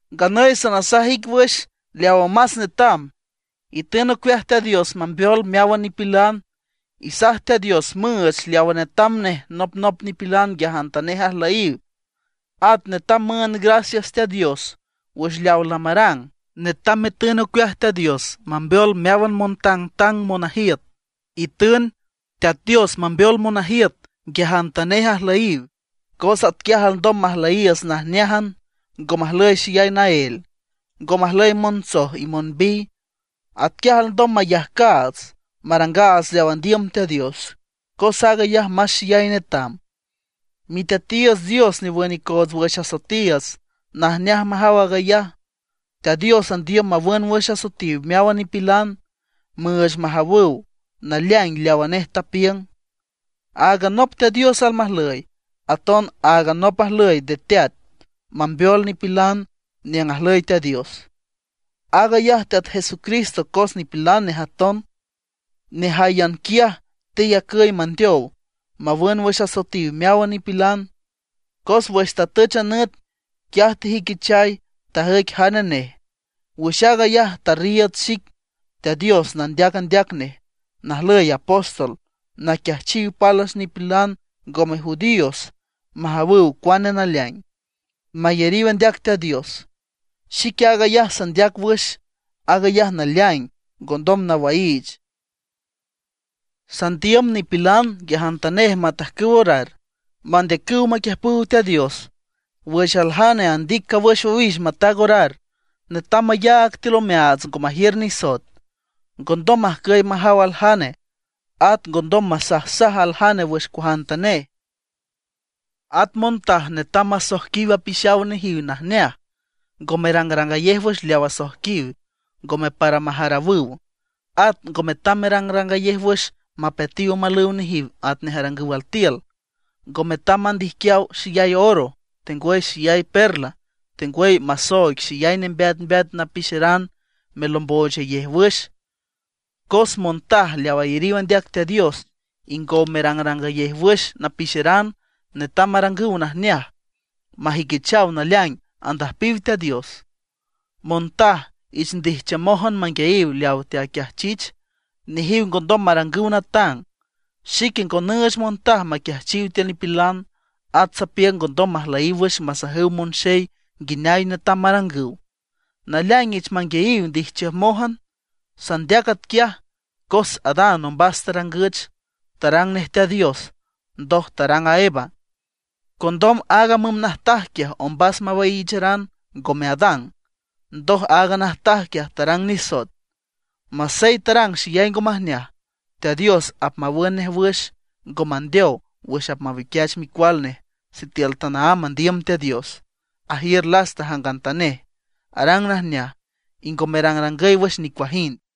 Nganüy sanasaj ic wüx leawa más netam. Itün ocueaj Teat Dios mambeol meáwan nipilan, isaj Teat Dios müüch leawa netam nej nopnop nipilan nguiajantanej ajlüyiw. At netam müünd gracias Teat Dios wüx leaw lamarang. Netam metün ocueaj Teat Dios mambeol meáwan montangtang monajiüt. Itün Teat Dios mambeol monajiüt nguiajantanej ajlüyiw, cos atquiaj alndom majlüyiiüts najneájan, ngo majlüy xeyay naél, ngo majlüy monstoj y monbiy. Atquiaj alndom mayajcaats, marangaats leaw andiüm Teat Dios, cos aag ayaj más xeyay netam. Miteatiiüts Dios newün icoots wüx asoetiiüts, najneaj majaw aag ayaj. Teat Dios andiüm mawün wüx asoetiw meáwan nipilan, müüch majawüw naleaing leawa nej tapiüng. Áagan nop Teat Dios almajlüy, aton áagan nop ajlüy de teat mambeol nipilan niüng ajlüy Teat Dios. Aag ayaj Teat Jesucristo cos nipilan nej aton. Nejáyan quiaj teyacüy mandeow mawün wüx asoetiw meáwan nipilan. Cos wüx tatüch a nüt, quiaj tejüiquichay, tajüic jane nej. Wüx aag ayaj tarriiüd xic Teat Dios nandeac andeac nej, najlüy apóstol, naquiajchiw pálwüx nipilan ngome judíos majawüw cuane naleaing, mayariw andeac Teat Dios. Xique aag ayaj sandeac wüx, aag ayaj naleaing, ngondom nawaiich. Sandiüm nipilan nguiajantanej matajcüw orar, mandeacüw maquiüjpüw Teat Dios. Wüx aljane andic cawüx owix mataag orar netam mayaag tiül omeaats ngo majiür nisoet, ngondom majcüy majaw aljane, at ngondom masajsaj aljane wüx cuajantanej. At montaj netam masoijquiw apixaw nejiw najneaj, ngo merangrangayej wüx leaw asoijquiw, ngome para majarawüw. At ngo metam merangrangayej wüx mapeatiw omalüw nejiw atnej arangüw altiül. Ngo metam mandijquiaw xeyay oro, tengwüy xeyay perla, tengwüy masooig xeyay nembeat napixeran melombochayej wüx. Cos montaj leaw ayariw andeac Teat Dios, ingow merangrangayej wüx napixeran netam marangüw najneaj, majüiquichaw naleaing andüjpiw Teat Dios. Montaj ich ndijchiümójan manguiayiw leawa teaquiajchich; nejiw ngondom marangüw natang. Xique ngo nüüch montaj maquiajchiw tiül nipilan; at sapiüng ngondom majlüyiw wüx masajüw monxey nguineay netam marangüw. Naleaing ich manguiayiw ndijchiümójan. Sandeac atquiaj cos Adán ombas tarangüch, tarang nej Teat Dios, ndoj tarang a Eva. Condom aaga müm najtaj quiaj ombas mawaiicheran, ngome Adán. Ndoj aaga najtaj quiaj tarang nisoet. Masey tarang xeyay ngo majneaj, Teat Dios apmawün nej wüx, ngo mandeow wüx apmawiquiach micual nej sitiül tanaámb andiüm Teat Dios, ajiür lasta jangantanej, arang najneaj, y ngo merangrangüy wüx nicuajind.